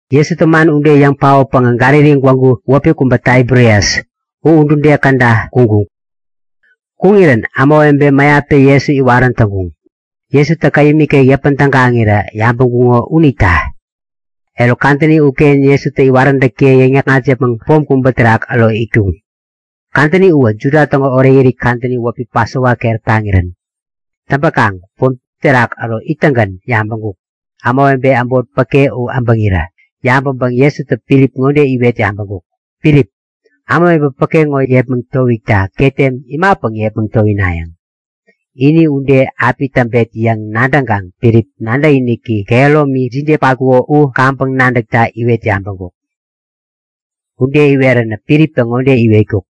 Jesutä man ude yäŋ paotpäŋä Galili gwägu (wäpi kubä Taibirias), u udude käda kuŋkuk. Kuŋirän ämawebe mäyaptä Jesu iwarän täŋkuŋ, Jesutä käyäm ikek yäpän tägaŋirä yabäŋkuŋo unita. Eruk, kadäni uken Jesutä iwaräntäkiye yäŋ-yäkŋat yäpmäŋ pom kubä terak äro itkuŋ. Kadäni uwä Juda täŋo orekirit kadäni wäpi Pasova keräp taŋirän. Täŋpäkaŋ pom uterak äro ittäŋgän yabäŋkuk; Ämawebe äbot päke u äbäŋirä yabäŋpäŋ Jesutä Filip ŋode iwet yabäŋkuk; Filip, ämawebe päke ŋo yepmäŋ towikta ketem imapäŋ yepmäŋ towinayäŋ? Ini ude api täŋpet yäŋ nadäŋkaŋ Filip nadäkiniki kehäromi jide patkuko u yäwän kaŋpäŋ nadäkta iwet yabäŋkuk. Ude iweränä Filiptä ŋode iwetkuk;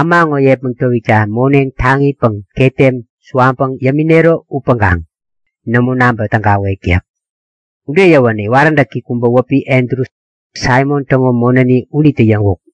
Äma ŋo yepmäŋ towikta moneŋ taŋipäŋ ketem suwaŋpäŋ yäminero upäŋkaŋ nämo naŋpä tägawek yäk. Ude yäwänä iwaräntäki kubä wäpi Andru, Saimon täŋo monäni unitä yäŋkuk;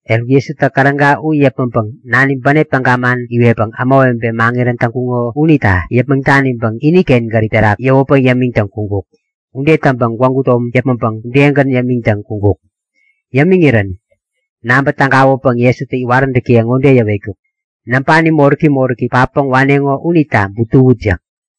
Eruk, Jesutä käräga u yäpmäŋpäŋ Nani bänep täga man iwetpäŋ ämawebe maŋirän täŋkuŋo unita yäpmäŋ daniŋpäŋ iniken gärip terak yäwäpäŋ yämiŋtäŋ kuŋkuk. Ude täŋpäŋ gwägu tom yäpmäŋpäŋ udegän yämiŋtäŋ kuŋkuk. Yämiŋirän nabä tägawäpäŋ Jesutä iwaräntäkiye ŋode yäwetkuk; Näŋpani moräki moräki patpäŋ waneŋo unita butuwut yäk.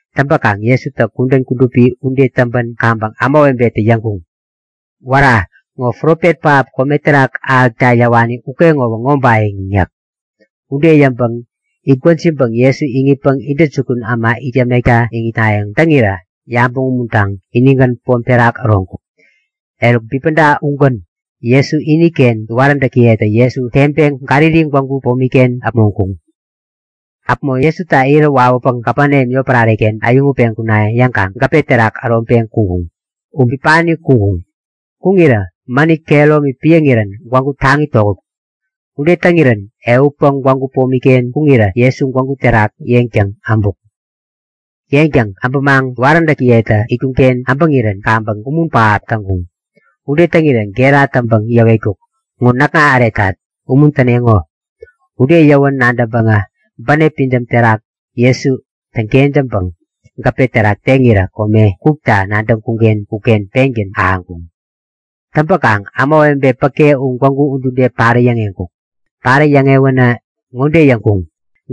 Täŋpäkaŋ Jesutä kudän kudupi ude täŋpän kaŋpäŋ ämawebetä yäŋkuŋ; Wära! Ŋo profet pähap kome terak ahäkta yäwani ukeŋowä ŋobayäŋ! yäk. Ude yäŋpäŋ itgwäjiŋpäŋ Jesu iŋitpäŋ intäjukun äma it yämekta iŋitnayäŋ täŋirä yabäŋ umuntaŋ inigän pom terak äroŋkuk. Eruk, bipäda ugän Jesu iniken iwaräntäkiyetä Jesu teŋpeŋ Galili gwägu pomi-ken äpmoŋkuŋ. Äpmo Jesuta irä wawäpäŋ Kapeneam yotpärare-ken äyäŋutpeŋ kuna yäŋkaŋ gäpe terak äroŋpeŋ kuŋkuŋ. U bipani kuŋkuŋ. Kuŋirä mänit kehäromi piäŋirän gwägu taŋi tokätkuk. Ude täŋirän ehutpäŋ gwägu bämopi-ken kuŋirä Jesu gwägu terak yeŋtäŋ äbuk. Yeŋtäŋ äbämaŋ iwaräntäkiyetä itkuŋ-ken äbäŋirän kaŋpäŋ umun pähap täŋkuŋ. Ude täŋirä gera täŋpäŋ yäwetkuk; Ŋo näkŋa äretat. Umuntäneŋo! Ude yäwän nadäŋpäŋä bänep pidäm terak Jesu täŋkentäŋpäŋ gäpe terak teŋirä kome kukta nadäŋkuŋ-ken uken pengän ahäŋkuŋ. Täŋpäkaŋ ämawebe päke u gwägu udude parä yäŋeŋkuk. Parä yäŋewänä ŋode yäŋkuŋ;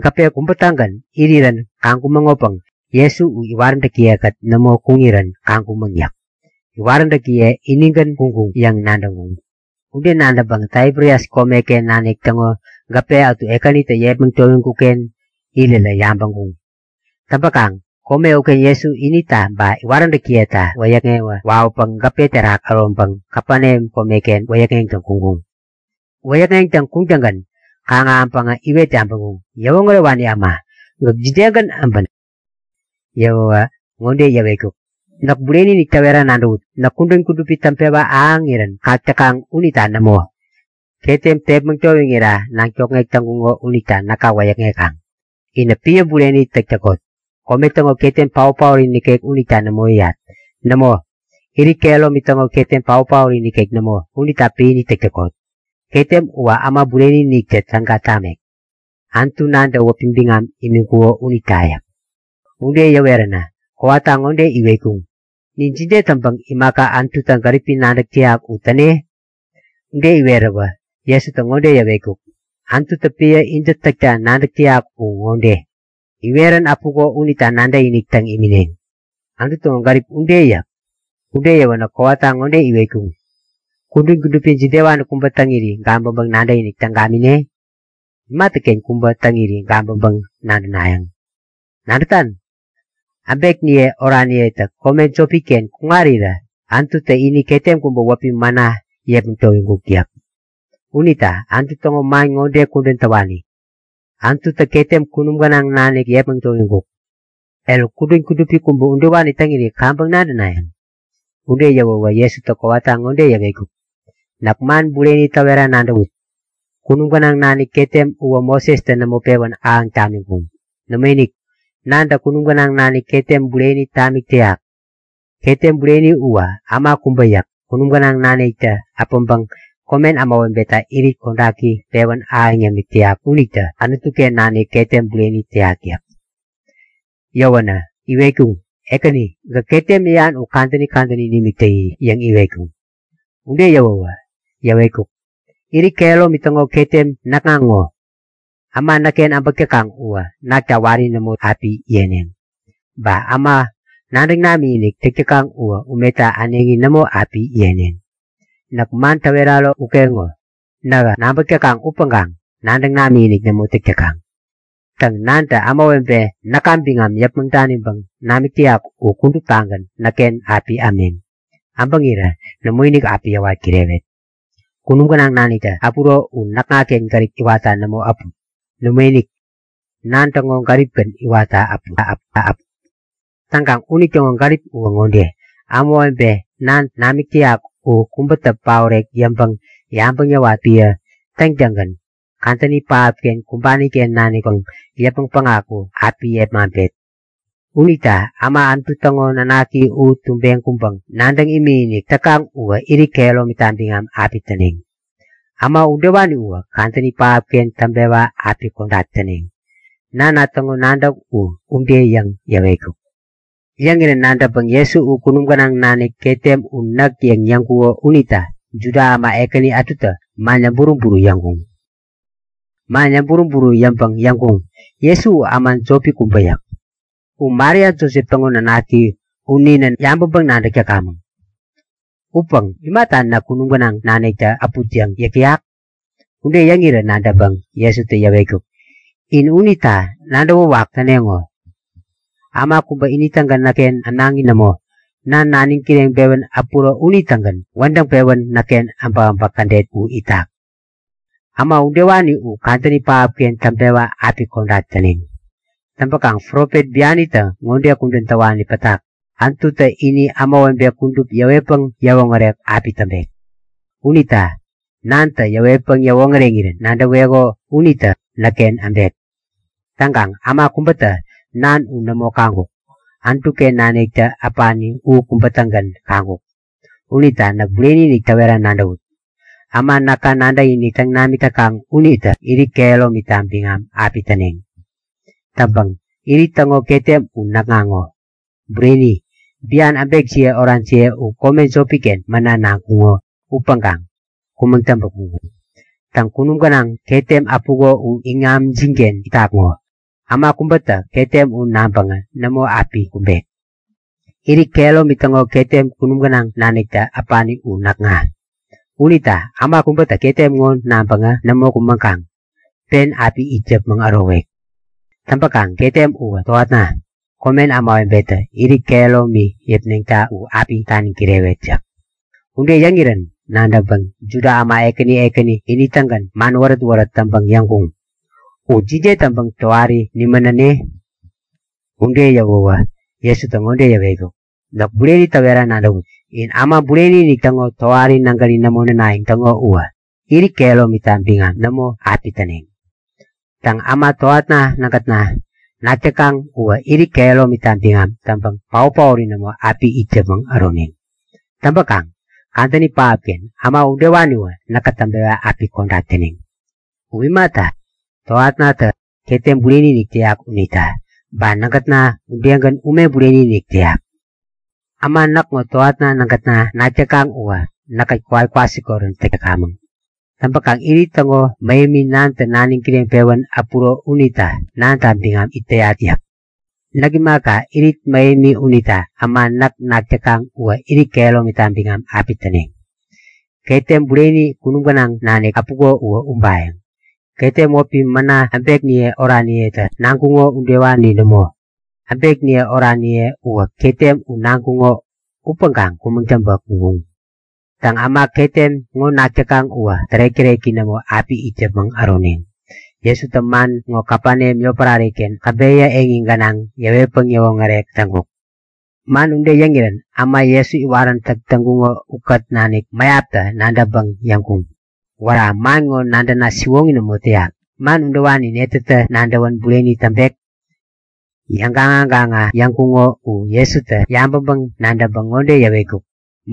Gäpe kubä-tägän irirän kaŋkumäŋopäŋ Jesu u iwaräntäkiye-kät nämo kuŋirän kaŋkumäŋ yäk. Iwaräntäkiye inigän kuŋkuŋ yäŋ nadäŋkuŋ. Ude nadäŋpäŋ Taibirias komeken nanik täŋo gäpe ätu Ekänitä yepmäŋ towiŋkuk-ken irirä yabäŋkuŋ. Täŋpäkaŋ kome uken Jesu inita ba iwaräntäkiyeta wäyäkŋewä wawäpäŋ gäpe uterak äroŋpäŋ Kapeneam komeken wäyäkŋeŋtäŋ kuŋkuŋ. Wäyäkŋeŋtäŋ kuŋtäŋgän kaŋ-ahäŋpäŋä iwet yabäŋkuŋ; Yäwoŋärewani äma, gäk jidegän äbän? Yäwäwä ŋode yäwetkuk; Näk bureni-inik täwera nadäwut; Näk kudän kudupi täŋpewa ahäŋirän kak täkaŋ unita nämo! Ketem tepmäŋ towiŋira naŋ tokŋek täŋkuŋo unita näka wäyäkŋekaŋ. Inä epän bureni täk täkot. Kome täŋo ketem, paot-paori nikek unita nämo yäyat. Nämo, irit kehäromi täŋo ketem paot-paori nikek nämo, unita piäni täk täkot. Ketem uwä Äma Bureni-iniktä täga tamek, Anutu Nantä wäpi biŋam imiŋkuko unita yäk. Ude yäweränä kowata ŋode iwetkuŋ; Nin jide täŋpäŋ imaka Anututä gäripi nadäk täyak u täne? Ude iweräwä Jesutä ŋode yäwetkuk; Anututä epän intä täkta nadäk täyak u ŋode; Iwerän äpuko unita nadäkinik täŋ imineŋ. Anutu täŋo gärip ude yäk. Ude yäwänä kowata ŋode iwetkuŋ; Kudän kudupi jidewani kubä täŋiri gabäŋpäŋ nadäkinik täŋ gamine? Imatäken kubä täŋiri gabäŋpäŋ-nadänayäŋ? Nadätan? Äbekniye oraniyetä kome jopi-ken kuŋarirä Anututä ini ketem kubä wäpi mana yepmäŋ towiŋkuk yäk. Unita Anutu täŋo man ŋode kudän täwani; Anututä ketem kunum gänaŋ nanik yepmäŋ towiŋkuk. Eruk, kudän kudupi kubä udewani täŋiri kaŋpäŋ nadänayäŋ? Ude yäwäwä Jesutä kowata ŋode yäwetkuk; Näk man bureni täwera nadäwut; Kunum gänaŋ nanik ketem uwä Mosestä nämo pewän ahäŋ tamiŋkuŋ. Nämoinik, Nantä kunum gänaŋ nanik ketem bureni tamik täyak. Ketem bureni uwä äma kubä yäk. Kunum gänaŋ naniktä äpäŋpäŋ komen ämawebeta irit kodaki pewän ahäŋ yämik täyak unitä Anutu-ken nanik ketem bureni täyak yäk. Yäwänä iwetkuŋ; Ekäni, gäk ketem yäyan u kadäni kadäni nimik täyi! yäŋ iwetkuŋ. Ude yäwäwä yäwetkuk; Irit kehäromi täŋo ketem näkŋa ŋo. Äma näkken äbäk täkaŋ uwä nakta wari nämo api yeneŋ. Ba äma nadäŋ namikinik täk täkaŋ uwä umeta äneŋi nämo api yeneŋ. Näk man täweraro ukeŋo; Nähä nabäk täkaŋ upäŋkaŋ nadäŋ namikinik nämo täk täkaŋ. Täŋ, Nantä ämawebe näka biŋam yäpmäŋ daniŋpäŋ namik täyak u kuduptagän näkken api ämneŋ. Äbäŋirä nämoinik api yäwat kirewet. Kunum gänaŋ naniktä äpuro u näkŋaken gärip iwatta nämo äput. Nämoinik, Nan täŋo gäripgän iwatta äput. Täŋkaŋ unitäŋo gärip uwä ŋode; Ämawebe Nantä namik täyak u kubätä paorek yäŋpäŋ-yabäŋ yäwat epän täŋtäŋgän kadäni pähapken kumbani-ken nanikpäŋ yäpmäŋ päŋaku api yepmaŋpet. Unita äma Anutu täŋo Nanaki u tumbeŋ kuŋkaŋ nadäŋ imikinik täkaŋ uwä irit kehäromita biŋam api täneŋ. Äma udewani uwä kadäni pähapken täŋpewa api kodak täneŋ. Nana täŋo nadäk u ude yäŋ yäwetkuk. Yäŋirän nadäŋpäŋ Jesu u kunum gänaŋ nanik ketem u näk yäŋ yäŋkuko unita Juda äma ekäni ätutä man yäŋburu-buru yäŋkuŋ. Man yäŋburu-buru yäŋpäŋ yäŋkuŋ; Jesu u äma jopi kubä yäk. U Maria Josep täŋo nanaki. U ninä yabäŋpäŋ-nadäk täkamäŋ. Upäŋ imata näk kunum gänaŋ naniktä äput yäŋ yäk täyak? Ude yäŋirä nadäŋpäŋ Jesutä yäwetkuk; In unita nadäwäwak täneŋo. Äma kubä ini-tägän näkken ämnaŋi nämo. Nan naniŋ kireŋpewän äpuro unitägän wädäŋpewän näkken äbäkäbäk kädet u itak. Äma udewani u kadäni pähapken täŋpewa api kodak täneŋ. Täŋpäkaŋ profet bianitä ŋode kudän täwani pätak; Anututä ini ämawebe kudup yäwetpäŋ yäwoŋärek api täŋpek. Unita Nantä iwetpäŋ iwoŋäreŋirän nadäweko unitä näkken äbek. Täŋkaŋ äma kubätä Nan u nämo kaŋkuk. Anutu-ken naniktä äpani u kubä-tägän kaŋkuk. Unita näk bureni-inik täwera nadäwut; Äma näka nadäkinik täŋ namik täkaŋ unitä irit kehäromita biŋam api täneŋ. Täŋpäŋ irit täŋo ketem u näkŋa ŋo. Bureni, bian äbekjiye orajiye u kome jopi-ken mana naŋkuŋo upäŋkaŋ kumäŋ täŋpä kuŋkuŋ. Täŋ, kunum gänaŋ ketem äpuko u iŋamjin-ken itak ŋo. Äma kubätä ketem u naŋpäŋä nämo api kumbek. Irit kehäromi täŋo ketem kunum gänaŋ naniktä äpani u näkŋa! Unita äma kubätä ketem ŋo naŋpäŋä nämo kumäŋkaŋ pen api it yäpmäŋ ärowek. Täŋpäkaŋ ketem uwä tohatna. Komen ämawebetä irit kehäromi yäpneŋta u api taniŋ kirewet yäk. Ude yäŋirän nadäŋpäŋ Juda äma ekäni ekäni ini-tägän man wärät-wärät täŋpäŋ yäŋkuŋ; U jide täŋpäŋ tohari nimän näne? Ude yäwäwä Jesutä ŋode yäwetkuk; Näk bureni täwera nadäwut; In Äma Bureni-inik täŋo tohari nägäri nämo nänayäŋ täŋo uwä irit kehäromita biŋam nämo api täneŋ. Täŋ, äma tohatna nägätna nak täkaŋ uwä irit kehäromita biŋam täŋpäŋ paot-paori nämo api it yäpmäŋ äroneŋ. Täŋpäkaŋ kadäni pähapken äma udewaniwä näkä täŋpewa api kodak täneŋ. U imata, tohatnatä ketem bureni-inik täyak unita. Ba nägätna udegän ume bureni-inik täyak. Äma näkŋo tohatna nägätna nak täkaŋ uwä näkkät kowat kwasikorän täk täkamäŋ. Täŋpäkaŋ Irit täŋo mähemi Nantä naniŋ kireŋpewän äpuro unita Nanta biŋam it täyat yäk. Näk imaka, irit mähemi unita äma näk nak täkaŋ uwä irit kehäromita biŋam api täneŋ. Ketem bureni kunum gänaŋ nanik äpuko uwä ubayäŋ. Ketem wäpi mana äbekniye oraniyetä naŋkuŋo udewani nämo. Äbekniye oraniye uwä ketem u naŋkuŋo upäŋkaŋ kumäŋ täŋpä kuŋkuŋ. Täŋ, äma ketem ŋo nak täkaŋ uwä tärek-täreki nämo api it yäpmäŋ äroneŋ. Jesutä man ŋo Kapeneam yotpärare-ken käbeyä eŋi gänaŋ yäwetpäŋ yäwoŋärek täŋkuk. Man ude yäŋirän äma Jesu iwaräntäk täŋkuŋo ukät nanik mäyaptä nadäŋpäŋ yäŋkuŋ; Wära, man ŋo nadäna siwoŋi nämo täyak. Man udewani netätä nadäwän bureni täŋpek? Yäŋgaŋa gaŋa yäŋkuŋo u Jesutä yabäŋpäŋ-nadäŋpäŋ ŋode yäwetkuk;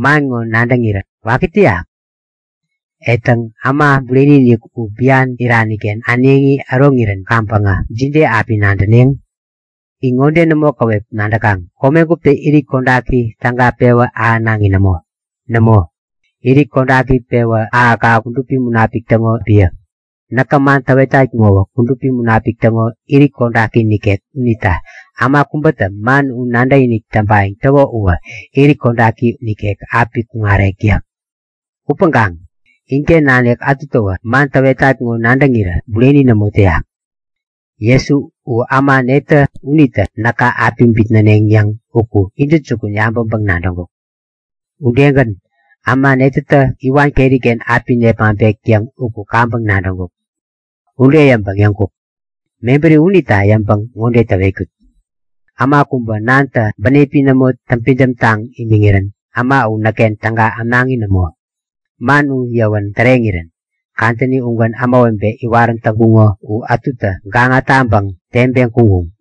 Man ŋo nadäŋirä waki täyak? E täŋ, Äma Bureni-inik u bian irani-ken äneŋi äroŋirän kaŋpäŋä jide api nadäneŋ? In ŋode nämo käwep nadäkaŋ; Kome guptä irit kodaki täga pewä ahänaŋi nämo. Nämo, irit kodaki pewä ahäk-ahäk uwä Kudupi Munapik täŋo epän. Näkä man täwetat ŋowä Kudupi Munapik täŋo irit kodaki nikek unita äma kubätä man u nadäkinik täŋpayäŋ täko uwä irit kodaki u nikek api kuŋarek yäk. Upäŋkaŋ inken nanik ätutäwä man täwetat ŋo nadäŋirä bureni nämo täyak. (Jesu u äma netä unitä näka api bitnäneŋ yäŋ uku intäjukun yabäŋpäŋ-nadäŋkuk. Udegän, äma netätä iwan keri-ken api nepmaŋpek yäŋ uku kaŋpäŋ nadäŋkuk.) Ude yäŋpäŋ yäŋkuk; Mebäri unita yäŋpäŋ ŋode täwetkut; Äma kubä Nantä bänepi nämo täŋpidäm taŋ imiŋirän äma u näkken täga ämnaŋi nämo. Man yäwa ude täreŋirän kadäni ugän ämawebe iwarän täŋkuŋo u ätutä gaŋa taŋpäŋ teŋpeŋ kuŋkuŋ.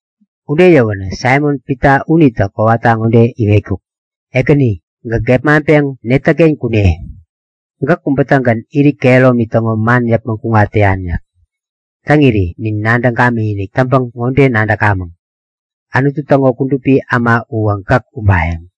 Ude yäwänä Saimon-Pita unitä kowata ŋode iwetkuk; Ekäni! Gäk gepmaŋpeŋ netäken kune? Gäk kubä-tägän irit kehäromi täŋo man yäpmäŋ kuŋat täyan yäk. Täŋiri nin nadäŋ gamikinik täŋpäŋ ŋode nadäkamäŋ; Anutu täŋo Kudupi Äma uwä gäk ubayäŋ.